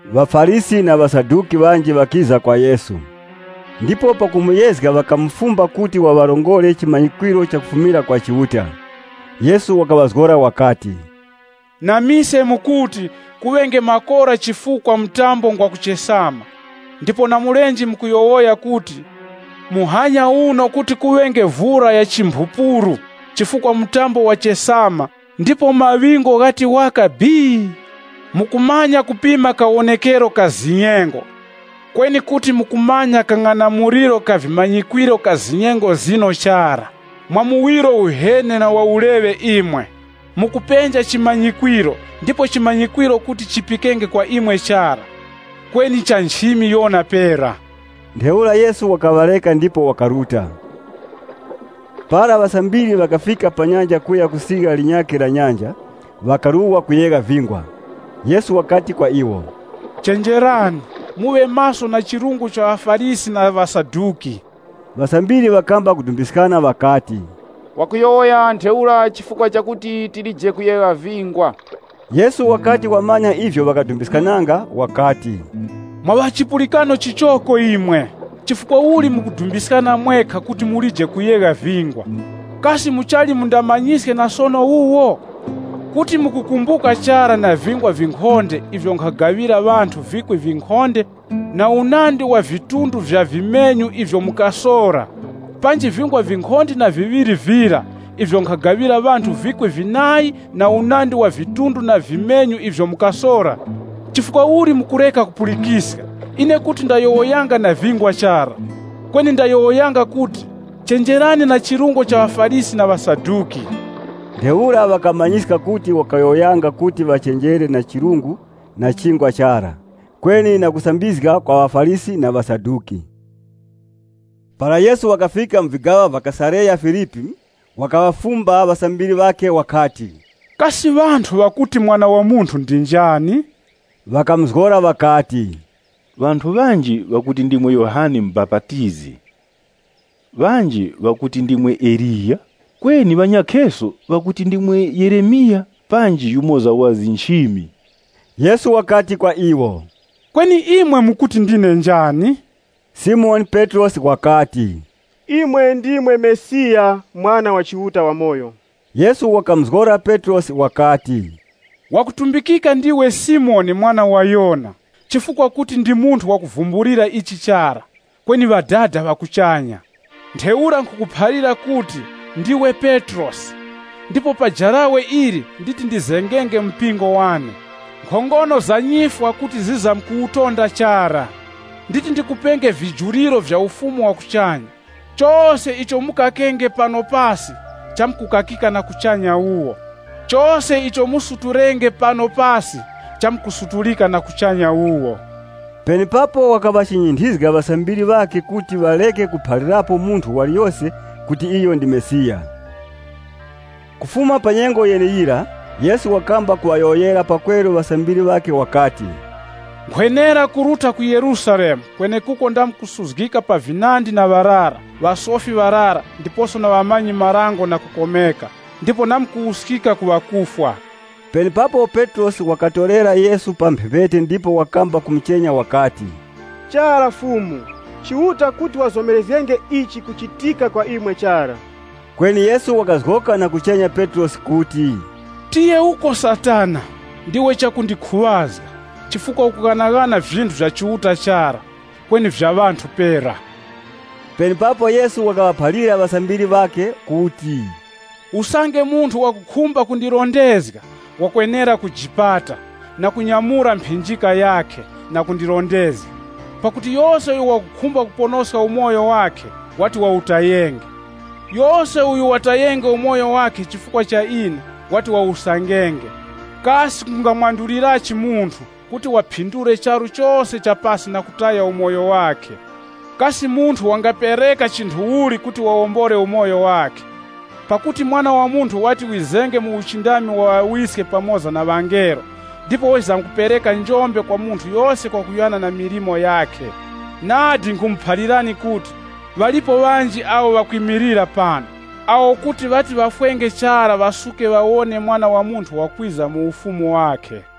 ŴaFarisi na ŵaSaduki, ŵanji ŵakiza kwa Yesu, ndipo pakumuyezga ŵakamufumba kuti waŵarongore chimanyikwiro chakufumira kwa Chiuta. Yesu wakaŵazgora wakati, “Na mise mukuti, ‘Kuŵenge makora chifukwa mtambo ngwa kuchesama.’ Ndipo na mulenje mukuyowoya kuti, ‘Muhanya uno kuti kuŵenge vura ya chimphupuru chifukwa mtambo wachesama ndipo maŵingu ghati waka bii.’ Mukumanya kupima kawonekero ka zinyengo kweni kuti mukumanya kang'anamuliro ka vimanyikwiro ka zinyengo zino chara. Mwa muwiro uheni na wa uleŵe imwe, mukupenja chimanyikwiro ndipo chimanyikwiro kuti chipikenge kwa imwe chara, kweni cha nchimi Yona pera.” Ntheura Yesu wakaŵareka ndipo wakaruta. Para Ŵasambiri ŵakafika pa nyanja kuya ku sirya linyakhe la nyanja, ŵakaruwa kuyegha vingwa. Yesu wakati kwa iwo, “Chenjerani, muŵe maso na chirungo cha ŵaFarisi na ŵaSaduki.” Ŵasambiri ŵakamba kudumbiskana ŵakati, “Wakuyowoya ntheura chifukwa chakuti tilije kuyegha vingwa.” Yesu wakati wamanya ivyo ŵakadumbiskananga wakati, “Mwa ŵa chipulikano chichoko imwe, chifukwa uli mukudumbiskana mwekha kuti mulije kuyegha vingwa? Kasi muchali mundamanyiske na sono wuwo? Kuti mukukumbuka chara na vingwa vinkhonde ivyo nkhagaŵira ŵanthu vikwi vinkhonde na unandi wa vidunga vya vimenyu ivyo mukasora? Panji vingwa vinkhonde na viŵiri vira ivyo nkhagaŵira ŵanthu vikwi vinayi na unandi wa vidunga na vimenyu ivyo mukasora? Chifukwa uli mukureka kupulikiska, ine kuti ndayowoyanga na vingwa chara? Kweni ndayowoyanga kuti, chenjerani na chirungo cha ŵaFarisi na ŵaSaduki.” Ntheura ŵakamanyiska kuti wakayowoyanga kuti ŵachenjere na chirungo cha chingwa chara, kweni na kusambizga kwa ŵaFarisi na ŵaSaduki. Para Yesu wakafika mu vigaŵa vya Kesareya-Filipi, wakaŵafumba ŵasambiri ŵakhe wakati, “Kasi ŵanthu ŵakuti Mwana wa Munthu ndi njani?” Ŵakamuzgora ŵakati, “Ŵanthu ŵanji ŵakuti ndimwe Yohane Mubapatizi, ŵanji ŵakuti ndimwe Eliya, kweni ŵanyakheso ŵakuti ndimwe Yeremiya panji yumoza wa nchimi.” Yesu wakati kwa iwo, “Kweni imwe mukuti ndine njani?” Simoni Petrosi wakati, “Imwe ndimwe Mesiya Mwana wa Chiuta wamoyo!” Yesu wakamuzgora Petrosi wakati, “Wakutumbikika ndiwe Simoni mwana wa Yona, chifukwa kuti ndi munthu wakuvumbulira ichi chara, kweni Ŵadada ŵa kuchanya. Ntheura nkhukuphalira kuti, ndiwe Petrosi, ndipo pa jarawe ili nditi ndizengenge mpingo wane. Nkhongono za nyifwa kuti zizamkuwutonda chara. Nditi ndikupenge vijuriro vya Ufumu wa kuchanya. Chose icho mukakenge pano pasi chamkukakika na kuchanya wuwo. Chose icho musutulenge pano pasi, chamkusutulika na kuchanya wuwo.” Penepapo wakaŵachinyinthizga ŵasambiri ŵakhe kuti ŵareke kuphalirapo munthu waliyose kuti iyo ndi Mesiya. Kufuma pa nyengo yeneyira, Yesu wakamba kuŵayowoyera pakweru ŵasambiri ŵakhe wakati, “Nkhwenera kuruta ku Yerusalemu kwenekuko ndamkusuzgika pa vinandi na ŵarara, ŵasofi ŵarara ndiposo na ŵamanyi-marango na kukomeka, ndipo na kuwuskika ku ŵakufwa.” Penepapo Petrosi wakatorera Yesu pa mphepete ndipo wakamba kumuchenya wakati, “Chara, Fumu, Chiuta kuti wazomerezgenge ichi kuchitika kwa imwe chara.” Kweni Yesu wakazgoka na kuchenya Petrosi wakati, “Tiye uko Satana! Ndiwe chakundikhuŵazga, chifukwa ukughanaghana vinthu vya Chiuta chara, kweni vya ŵanthu pera.” Penepapo Yesu wakaŵaphalira ŵasambiri ŵakhe kuti, “Usange munthu wakukhumba kundirondezga, wakwenera kujipata, kunyamura mphinjika yakhe, na kundirondezga. Pakuti yose uyo wakukhumba kuponoska umoyo wakhe, wati wawutayenge. Yose uyo watayenge umoyo wakhe chifukwa cha ine, wati wawusangenge. Kasi kungamwandulirachi munthu kuti waphindule charu chose cha pasi na kutaya umoyo wakhe? Kasi munthu wangapereka chinthu uli kuti wawombole umoyo wakhe? Pakuti Mwana wa Munthu wati wizenge mu uchindami wa ŵaWiske pamoza na ŵangelo ndipo wizamkupereka njombe kwa munthu yose kwakuyana na milimo yakhe. Nadi nkhumuphalirani kuti, ŵalipo ŵanji awo ŵakwimilira pano, awo kuti ŵati ŵafwenge chara ŵasuke ŵawone Mwana wa Munthu wakwiza mu Ufumu wakhe.”